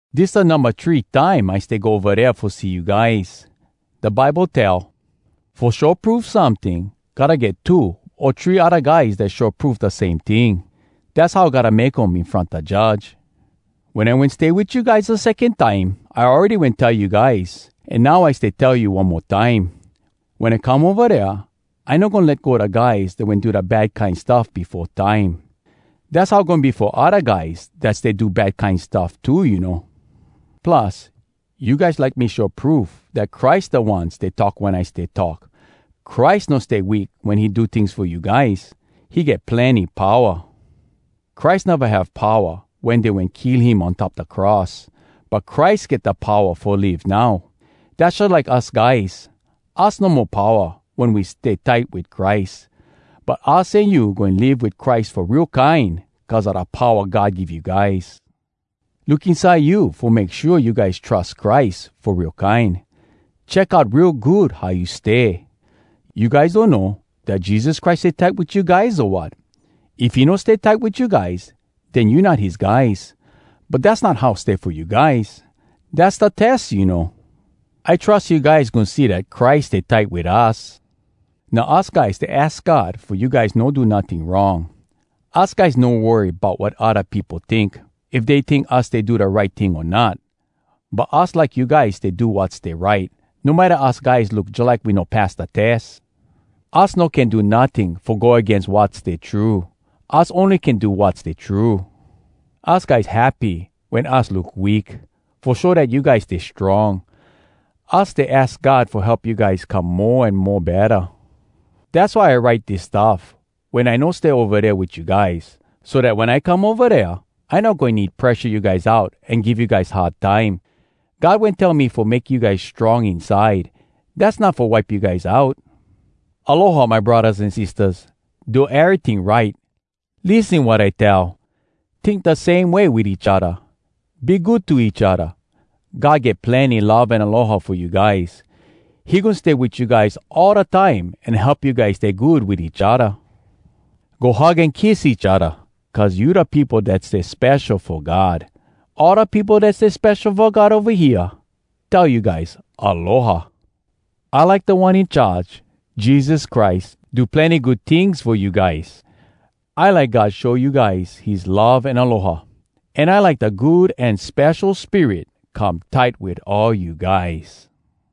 Dis da numba three time I stay go ova dea fo see you guys. Da Bible tell, “Fo show proof someting, gotta get two o three odda guys dat show proof da same ting. Dass how gotta make um in front da judge.” Wen I wen stay wit you guys da secon time, I awready wen tell you guys, an now I stay tell you one mo time: Wen I come ova dea I no goin let go da guys dat wen do da bad kine stuff befo time. Dass how goin be fo odda guys dat stay do bad kine stuff too, you know. Plus, you guys like me show proof dat Christ da One stay talk wen I stay talk. Christ no stay weak wen he do tings fo you guys. He get plenny powa. Christ neva have powa wen dey wen kill him on top da cross. But Christ get da powa fo live now. Dass jalike us guys. Us no mo powa wen we stay tight wit Christ. But us an you goin live wit Christ fo real kine cuz a da powa God give you guys. Look inside you fo make shua you guys trus Christ fo real kine. Check out real good how you stay. You guys donno dat Jesus Christ stay tight wit you guys, o wat? If he no stay tight wit you guys, den you not his guys. But dass not how stay fo you guys! Dass da tes, you know! I trus you guys goin see dat Christ stay tight wit us. Now us guys stay aks God fo you guys no do notting wrong. Us guys no worry bout wat odda peopo tink, if dey tink us stay do da right ting o not. But us like you guys stay do wat stay right, no matta us guys look jalike we no pass da tes. Us no can do notting fo go agains wat stay true. Us ony can do wat stay true. Us guys happy wen us look weak, fo show dat you guys stay strong. Us stay aks God fo help you guys come mo an mo betta. Dass why I write dis stuff wen I no stay ova dea wit you guys, so dat wen I come ova dea, I no goin need presha you guys out an give you guys hard time. God wen tell me fo make you guys strong inside, dass not fo wipe you guys out. Aloha, my braddahs an sistahs. Do eryting right. Lissen wat I tell. Tink da same way wit each odda. Be good to each odda. God get plenny love an aloha fo you guys. He goin stay wit you guys all da time an help you guys stay good wit each odda. Go hug an kiss each odda cuz you da peopo dat stay spesho fo God. All da peopo dat stay spesho fo God ova hea tell you guys “Aloha.” I like Da One In Charge, Jesus Christ, do plenny good tings fo you guys. I like God show you guys his love an aloha. An I like da Good An Spesho Spirit come tight wit all you guys.